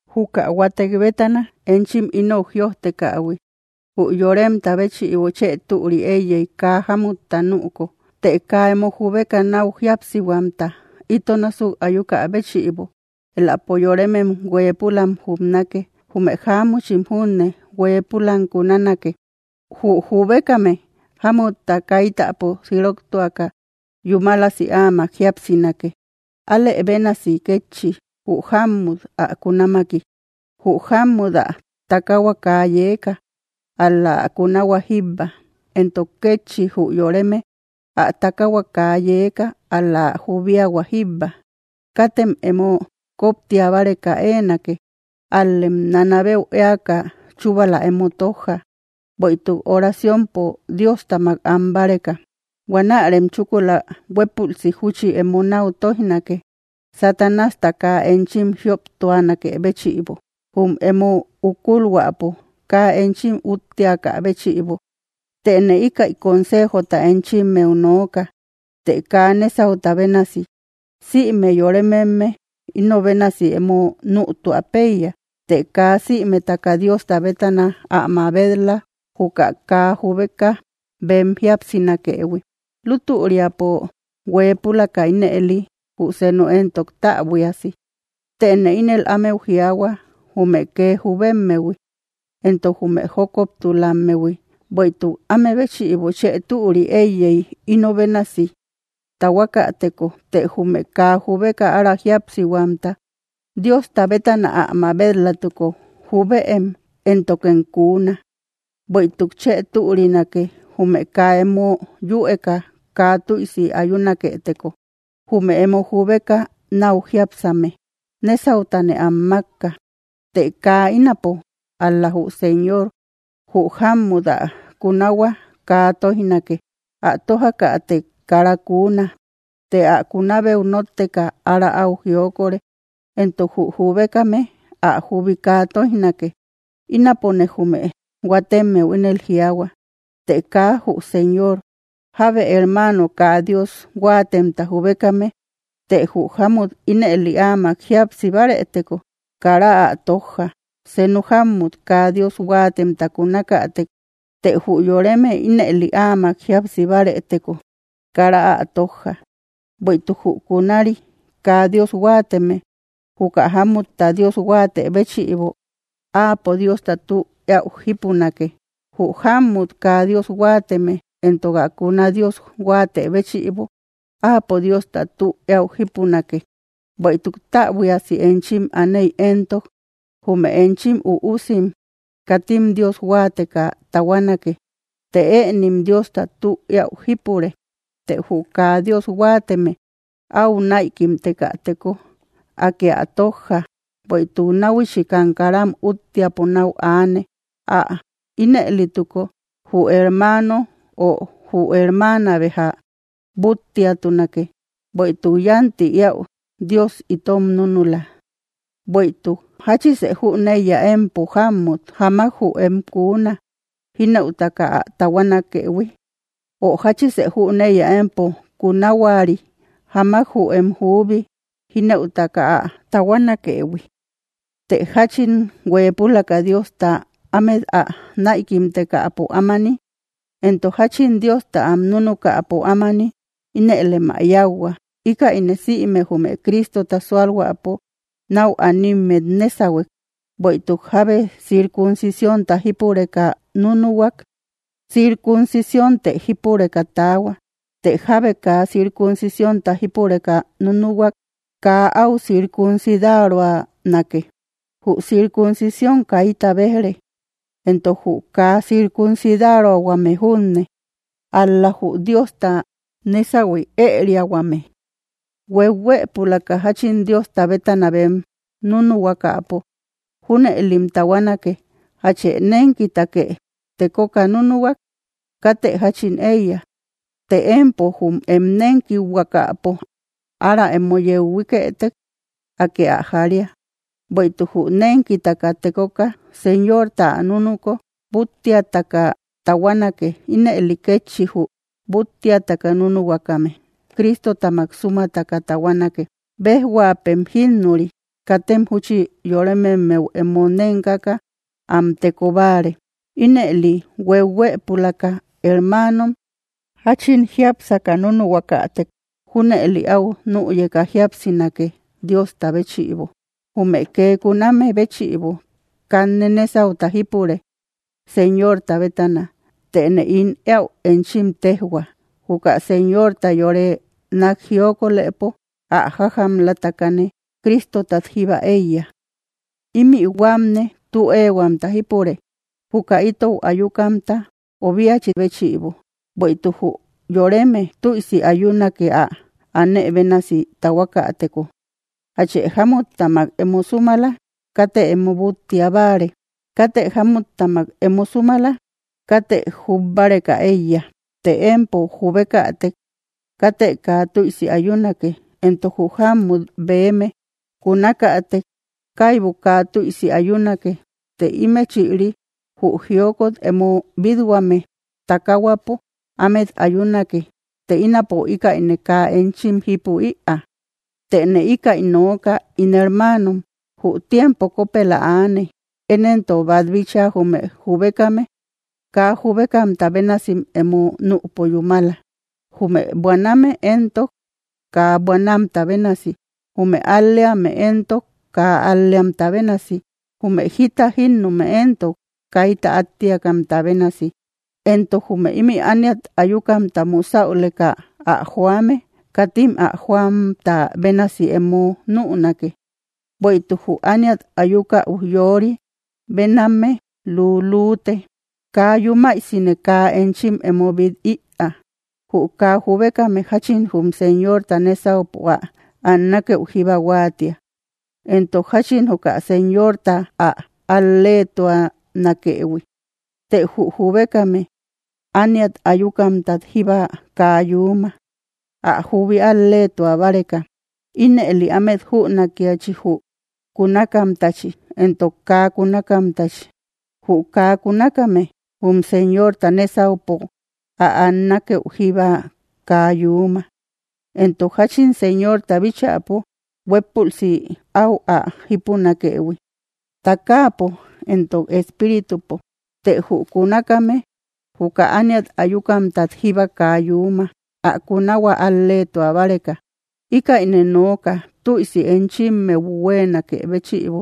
Juka huatek bétana enchim ínou jïojtekähui. Jü yoremta béchïbo chë türi eiyey kaa jámutta nüko. Të kaa emo jubeka nau jíapsihuamta ito násuk ayukä béchïbo, elapo yoremem huëpulam jubnake, jume jáamuchim junne huëpulam kunanake. Jü jubekame jámutta kaitäpo siroktuaka yúmalasi ámak jíapsinake, alë bénasi kétchi jü jammut ä kunáamaki. Jü jammut ä takahua kaa yeeka, ál‑la ä kunahua jíbba, entok kétchi jü yoreme ä takahua kaa yeeka ál‑la ä jubiahua jíbba. Katem emo koptia báreka éenake, al‑lem nanabeu eaka chubala emo tojja, bueïtuk oraciompo Diostáamak am báreka, huanärem chúkula huepulsi júchi emo nau toijnake, Satanásta kaa enchim jioptuanakë béchïbo. Jum emo ukulhuapo kaa enchim úttiakabéchïbo. Téne íkäi consejota enchimmeu nooka, të kaa nesauta bénasi. Sïme yorememne inobénasi emo nütua peiya, të kaa sïmetaka Diosta bétana ä mabet‑la juka kaa jubeka bem jíapsinakëhui, lutüriapo hueepulaka ínëli, jü senu entok täbuíasi. Tëne ínel ámeu jiaahua, jume kee jubemmehui entok jume jokoptulammehui, bueïtuk amebéchïbo chë türi eiyey inobénasi tahuakateko. Të jume kaa jubeka ára jíapsihuamta, Diosta bétana ä mabet‑latuko, jubëem, éntokem kuuna. Bueïtuk chë türinake. Jume kaa emo yüeka kaa tüisi ayunaketeko. Jume emo jubeka nau jiápsame, nesautane am makka, të kaa ínapo, ál-la jü Señor: Jü jámmut ä kunahua kaa toijnake; ä tójakätek, kara kunaa, të ä kunabeu notteka ára au jiokore; entok jü jubekame ä jubi kaa toijnake. Ínapone jume huatemmeu ínel jiaahua, të kaa jü Señor: jábe hermano kaa Dios huatemta jubekame, të jü jámut ínëli áamak jíapsibarëteko. Kara ä tojja. Senu jammut, kaa Dios huatemta kunakätek, të jü yoreme ínëli ámak jíapsibareteko. Kara ä tojja. Bueïtuk jü kunari kaa Dios huateme, juka jámmutta Dios huate béchïbo, áapo Diosta tü eäu jípunake; jü jámut kaa Dios huateme entok ä kuna Dios huate béchïbo áapo Diosta tü eäu jípunake, bueïtuk täbuiasi enchim aaney entok, jume enchim üusim katim Dios huateka tahuanake, të ënim Diosta tü eäu jípure. Të jü kaa Dios huateme aü naïkimtekateko, Akë ä tojja. Bueïtuk nahuichikam karam úttiapo nau aane. Ä inelituko jü hermano o jü hermana beja búttiatunake, bueïtuk yanti eäu Dios itom núnula. Bueïtuk, ¿jáchise jüneiya, empo jámmut, jáamak jü em kuuna jinëutaka ä tahuanakëhui? ¿Ö jáchise jüneiya, empo kunahuari, jáamak jü em jubi jinëutaka ä tahuanakëhui? Të jáchin hueepulaka Diosta ámet ä naïkimtekapo ámani, entok jáchin Diosta am núnukäpo ámani ínëlem ä yauhua, íkäine sïme jume Cristota sualhuäpo nau animmet nesahuek. ¿Bueïtuk jábe circunsicionta jípureka núnuhuak? Circuncicionte jípureka taahua, ¿të jábe kaa circunsicionta jípureka núnuhuak? Kaa au circunsidaruanake. Jü circunsicion kayta bejre, entok jü kaa circunsidaruahuame junne, ál‑la jü Diosta nésahui ëriahuame. Huehuëpulaka jáchin Diosta bétana bem nunuhuakapo, junëlim tahuanake. ¿Jachë nenkitake tekoka núnuhuak? Katë jáchin eiya; të empo jum em nenkihuakapo ára emo yeu huíkëtek, Akë ä jaria. Bueïtuk jü nenkitaka tekoka, Señorta ä núnuko, búttiataka tahuanake, ínëli kétchi jü búttiataka núnuhuakame, Cristotamak sumataka tahuanake. Bejhuapëm jinnuri, katem júchi yorememmeu emo nenkaka am teko bare. Ínëli, huehuëpulaka, hermanom, jachin jiápsaka núnuhuakatek, junëli au nüyeka jíapsinake Diosta béchïbo. Jume kee kuname béchïbo, kanne nesauta jípure Señorta bétana, tëne ín eäú enchim tejhua, juka Señorta yore nak jiokolëpo ä jajamlatakane, Cristotat jíba eiya. Imï huamne tü ehuamta jípure, juka itou ayukamta obiachi béchïbo, bueïtuk jü yoreme tüisi ayunake ä aane bénasi tahuakatëko. ¿Jatchë jámuttamak emo súmala? Katë emo búttia báare. ¿Katë jámuttamak emo súmala? Katë jub báreka eiya. Të empo jubekätek, katë kaa tüisi ayunake; entok jü jamut beme kunakätek kaybu kaa tüisi ayunake, të ímechïri jü jiokot emo bit‑huame takahuapo ámet ayunake, të ínapo íkäine kaa enchim jipu ïa. Tëne ikaï nooka, ín hermanom: Jü tiempo kopela aane. Én entok bat bitcha, jume jubekame, kaa jubekamta bénasim emo nüpo yúmala; jume buaname éntok, kaa buanamta bénasi; jume al‑leame éntok, kaa al‑leamta bénasi; jume jita jinnume entok, kayta attiakamta bénasi. Entok jume imï ániat ayukamta musauleka ä joame, katim ä joamta bénasi emo núnake, bueïtuk jü ániat ayuka ujyori béname lülüte. Kaa yúmaisine kaa enchim emo bit ïa. Jü kaa jubekame jáchin jum Señorta nesaupo ä annakeu jíba huatia, entok jachin juka Señorta ä al-letuanakëhui; të jü jubekame, ániat ayukamtat jíba kaa yúma, ä jubi al‑letua báreka. Ínëli ámet júnakiachi jü kunakamtachi entok kaa kunakamtachi, jü kaa kunakame jum Señorta nésaupo ä annakeu jíba kaa yúma, entok jachin Señorta bíchäpo huepulsi au ä jipunakëhui, taakapo entok espíritupo; të jü kunakame juka ániat ayukamtat jíba kaa yúma, ä kunahua al‑letua báreka. Ikaïne nooka tüisi enchimeu huenakë béchïbo,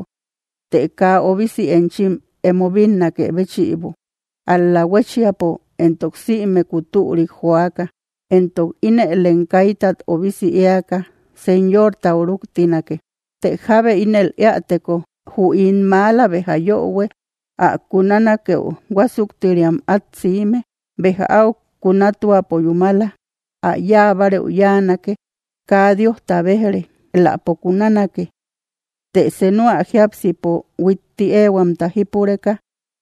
të kaa obisi enchim emo bínnakë béchïbo, ál‑la huéchiapo entok simeku türik joaka, entok inëlem kaytat obisi eaka Señortau ruktinake. Të jábe ínel eäteko: Jü ín mala béja yöhue ä kunanakeu huasuktiriam at siime. Béja au kunatuapo yúmala, ä yáa bareu yanake, kaa Diosta bejre, eläpo kunanake. Të senu ä jiápsipo huitti ehuamta jípureka,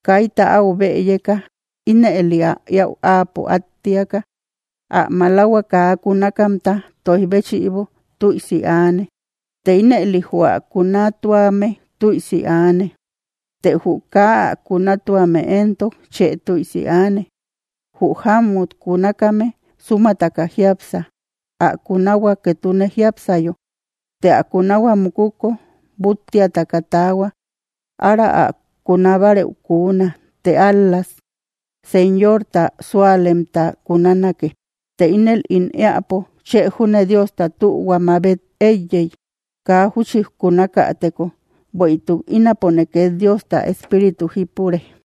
kayta áu bëyeka, ínëli ä éäu áapo attiaka, ä malahua kaa kunakamta toij béchïbo, tüisi aane. Të ínëli jü ä kunatuame, tüisi aane. Të jü kaa ä kunatuame entok, chë tüisi aane. Jü jamut kunakame súmataka jiápsa, ä kunahua ketune jiápsayo; të ä kunahua mukuko búttiataka taahua, ára ä kunabareu kuna, të ál‑la Señorta sualemta kunanake. Të ínel ín eäpo, chë júne Diosta tühua mabet eiyey kaa júchi kunakäteko, bueïtuk ínapone ket Diosta Espíritu jípure.